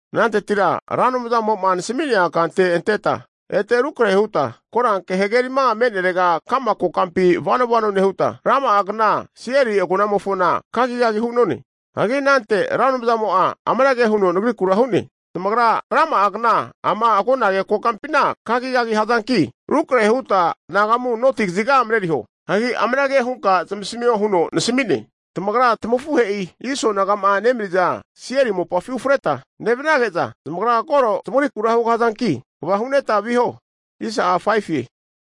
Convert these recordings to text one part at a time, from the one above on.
Anantetira Ra Anumzamo'ma nasami'nea kante anteta ete rukrahe huta, Koranke Hagerima me'nerega ka'ma kokampi vano vano nehuta, rama'a kna Seiri agonamofona kagikagia hu'none. Hagi anante Ra Anumzamo'a amanage huno nagrikura hu'ne, tamagra rama'a kna ama agonage kokampina kagikagi hazanki, rukrahe huta anagamu noti kaziga mareriho. Hagi amanage hunka zamasamio huno nasami'ne, tamagra tamafuhe'i Iso naga'ma nemaniza Seiri mopafi ufreta nevanage'za, zamagra koro tamagrikura hugahazanki, kva hu'neta viho.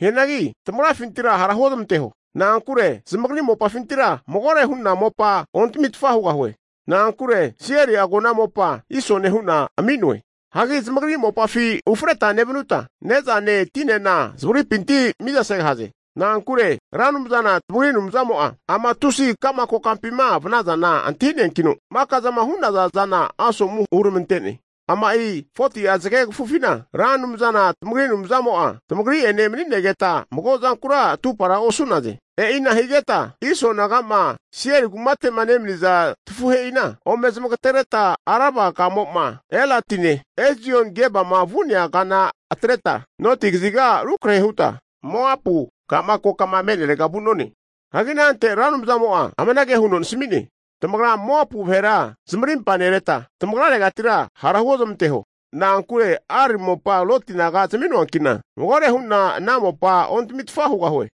Hianagi tamagrafintira hara huozamanteho, na'ankure zamagri mopafintira magore hu'na mopa ontamitfa hugahue. Na'ankure Seiri agona mopa Isone hu'na ami'noe. Hagi zamagri mopafi ufreta nevanuta, ne'zane tinena zamagripinti mizasegahaze. Na'ankure Ra Anumzana tamagri Anumzamo'a ama tusi ka'ma kokampima vanazama'a antahi'neankino, maka zama hu'naza zana asomu huramante'ne. Ama'i 40'a zage kafufina Ra Anumzana tamagri Anumzamo'a tamagri'ene mani'negeta mago zankura atupara osu'naze. E'ina higeta Iso naga'ma Seiri kumate'ma nemaniza tafuhe'ina ome zamagatereta Araba kamo'ma Elatine, Ezion-Gebama vu'nea kana atreta noti kaziga rukrahe huta Moapu ka'ma kokama me'nerega vu'none. Hagi anante Ra Anumzamo'a amanage huno nasami'ne, Tamagra Moapu vahera zamarimpa nereta, tamagraregatira hara huozmanteho. Na'ankure Ar mopa Loti naga zami'noanki'na, magore hu'na ana mopa ontamitfa hugahue.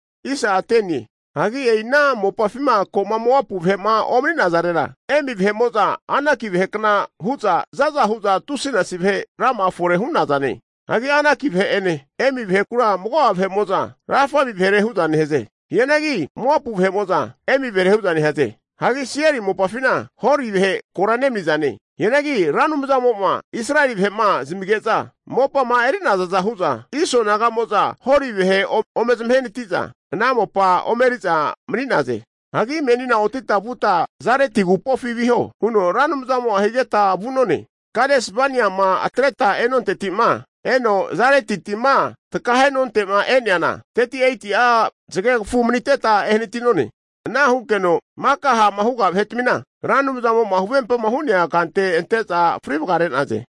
(Hagi e'i ana mopafima ko'ma Moapu vahe'ma omani'nazarera, Emi vahe'mo'za Anaki vahekna hu'za za'za hu'za tusinasi vahe rama'a fore hu'nazane. Hagi Anaki vahe'ene Emi vahekura mago'a vahe'mo'za Rafaimi vahere hu'za nehaze. Hianagi Moapu vahe'mo'za, Emi vahere hu'za nehaze. Hagi Seiri mopafina Hori vahe kora nemanizane. Hianagi Ra Anumzamo'ma Israeli vahe'ma zamige'za mopama eri'nazaza hu'za, Iso naga'mo'za Hori vahe ome zamahenati'za, ana mopa omeri'za mani'naze.) Hagi menina otita vuta Zareti agupofi viho, huno Ra Anumzamo higeta vu'none. Kades Baniama atreta e'nontetima eno Zareti tima takahe'nonte'ma e'neana, 38'a zagekfu manita ehanati'none. Ana hunkeno maka ha'ma huga vahe'tmina Ra Anumzamo'ma huvempama hu'nea kante ante'za fri vagare'naze.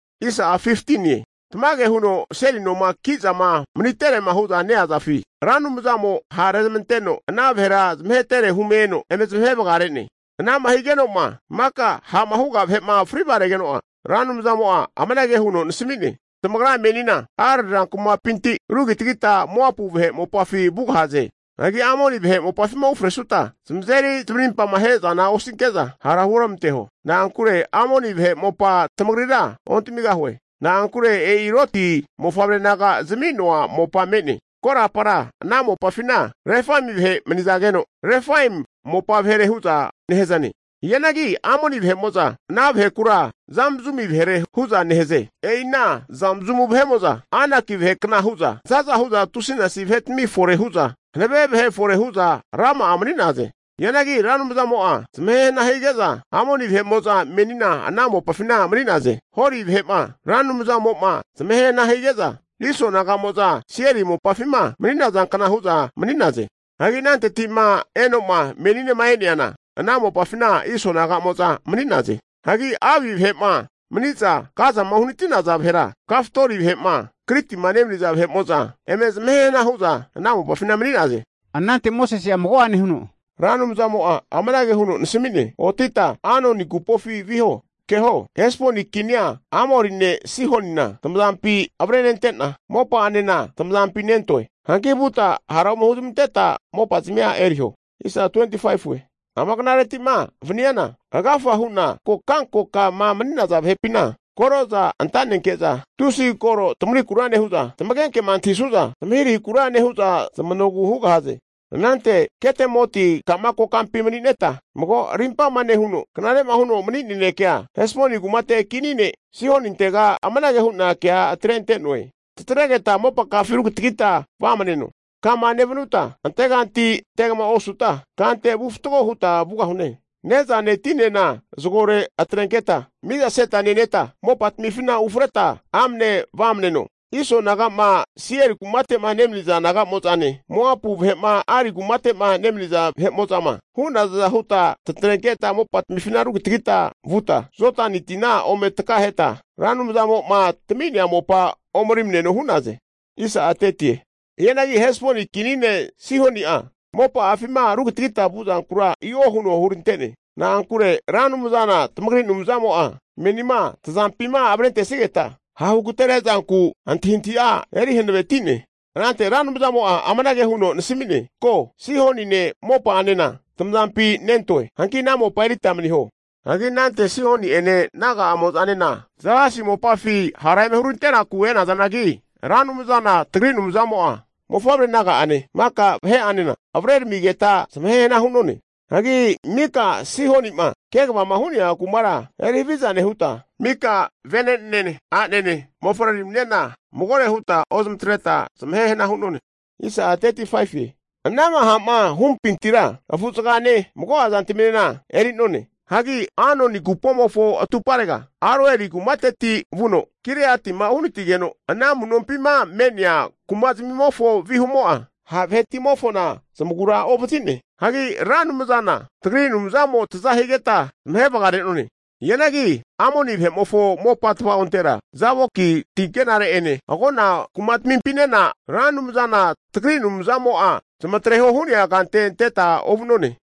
Tamage huno seli noma ki'zama maniterema hu'za neazafi, Ra Anumzamo ha'rezamanteno ana vahera zamahetere hume eno eme zamahe vagare'ne. Ana'ma higeno'ma maka ha'ma huga vahe'ma fri vagaregeno'a, Ra Anumzamo'a amanage huno nasami'ne, Tamagra menina Ar rankumapinti rugitagita Moapu vahe mopafi vugahaze. Hagi Amoni vahe mopafima ufresuta, zamazeri zamarimpamahe zana osinke'za, hara huoramanteho. Na'ankure Amoni vahe mopa tamagrira ontamigahue. Na'ankure e'i Loti mofavre naga zami'noa mopa me'ne. (Korapara ana mopafina Refaim vahe mani'nazageno, Refaimi mopa vahere hu'za nehazane. Hianagi Amoni vahe'mo'za ana vahekura Zamzumu vahere hu'za nehaze. E'ina Zamzumu vahe'mo'za Anaki vahe kna hu'za zaza hu'za tusinasi vahetami fore hu'za hanave vahe fore hu'za rama'a mani'naze. Hianagi Ra Anumzamo'a zamahe hana hige'za Amoni vahe'mo'za menina ana mopafina mani'naze. Hori vahe'ma Ra Anumzamo'ma zamahe hana hige'za, Iso naga'mo'za Seiri mopafima mani'naza kna hu'za mani'naze. Hagi ananteti'ma eno'ma meninema e'neana, ana mopafina Iso naga'mo'za mani'naze. Hagi Avi vahe'ma mani'za Gazama uhanati'naza vahera, Kaftori vahe'ma Kritima nemaniza vahe'mo'za eme zamahe hana hu'za ana mopafina mani'naze.) Anante Mosese'a mago'ane huno, Ra Anumzamo'a amanage huno nasami'ne, otita Anoni agupofi viho. Keho, Hesboni kinia Amori ne' Sihonina tamazampi avrenente'na, mopa'anena tamazampi nentoe. Hanki vuta hara ome huzmanteta mopazamia eriho. Ama knareti'ma vaniana agafa hu'na kokankokama mani'naza vahepina, koroza anta'nenke'za tusi koro tamagrikura nehu'za, tamagenkema antahisu'za zamahirahikura nehu'za, zamanogu hugahaze. Anante Ketemoti ka'ma kokampi mani'neta mago rimpama nehuno, knare'ma huno mani nanekea Hesboni kumate kini ne' Sihonintega anage hu'na kea atre'noe, tatregeta mopaka'afina rugitagita vamaneno. Kama nevanuta anteganti antegama osuta, kante vu fatgo huta vugahune. Ne'zane tinena zagore atrenketa mizaseta neneta, mopatamifina ufreta amne vamaneno. Iso naga'ma Seiri kumate'ma nemaniza naga'mo'zane, Moapu vahe'ma Ari kumate'ma nemaniza vahe'mo'zama hu'nazaza huta tatrenketa mopatamifina rugitagita vuta Jodani tina ome takaheta Ra Anumzamo'ma tami'nea mopa omerimaneno hu'naze. Hianagi Hesboni kini ne' Sihoni'a mopa'afima rugitagitama vuzankura i'o huno hurante'ne. Na'ankure Ra Anumzana tamagri Anumzamo'a menima tazampima avrentesigeta ha' hugateresunku antahintahi'a eri hanaveti'ne. Anante Ra Anumzamo'a amanage huno nasami'ne, Antahiho! Sihonine mopa'anena tamazampi nentoe. Hanki ana mopa erita maniho. Hagi anante Sihoni'ene naga'amo'zanena Zahasi mopafi hara eme hurante'naku e'nazanagi, Ra Anumzana tagri Anumzamo'a Sihonine mofavre naga'ane, maka vahe'anena avreramigeta, zamahe hana hu'none. Hagi mika Sihoni'ma kegavama hu'nea kumara eri haviza nehuta, mika vene'nene, a'nene mofavreraminena magore huta ozmatreta zamahe hana hu'none. Anama ha'ma hupintira afu'zagane, mago'a zantaminena eri'none. Hagi Arnoni agupomofo atumparega Aroeri kumateti vuno Kireatima uhanatigeno, ana amu'nompima me'nea kumazmimofo vihumo'a ha' vahe'timofona zamagura ovazi'ne. Hagi Ra Anumzana tagri Anumzamo taza higeta zamahe vagare'none. Hianagi Amoni vahe'mofo mopa tava'ontera, Jaboki ti ankenare'ene, agona kumatamimpinena Ra Anumzana tagri Anumzamo'a zamatreho hu'nea kante anteta ovu'none.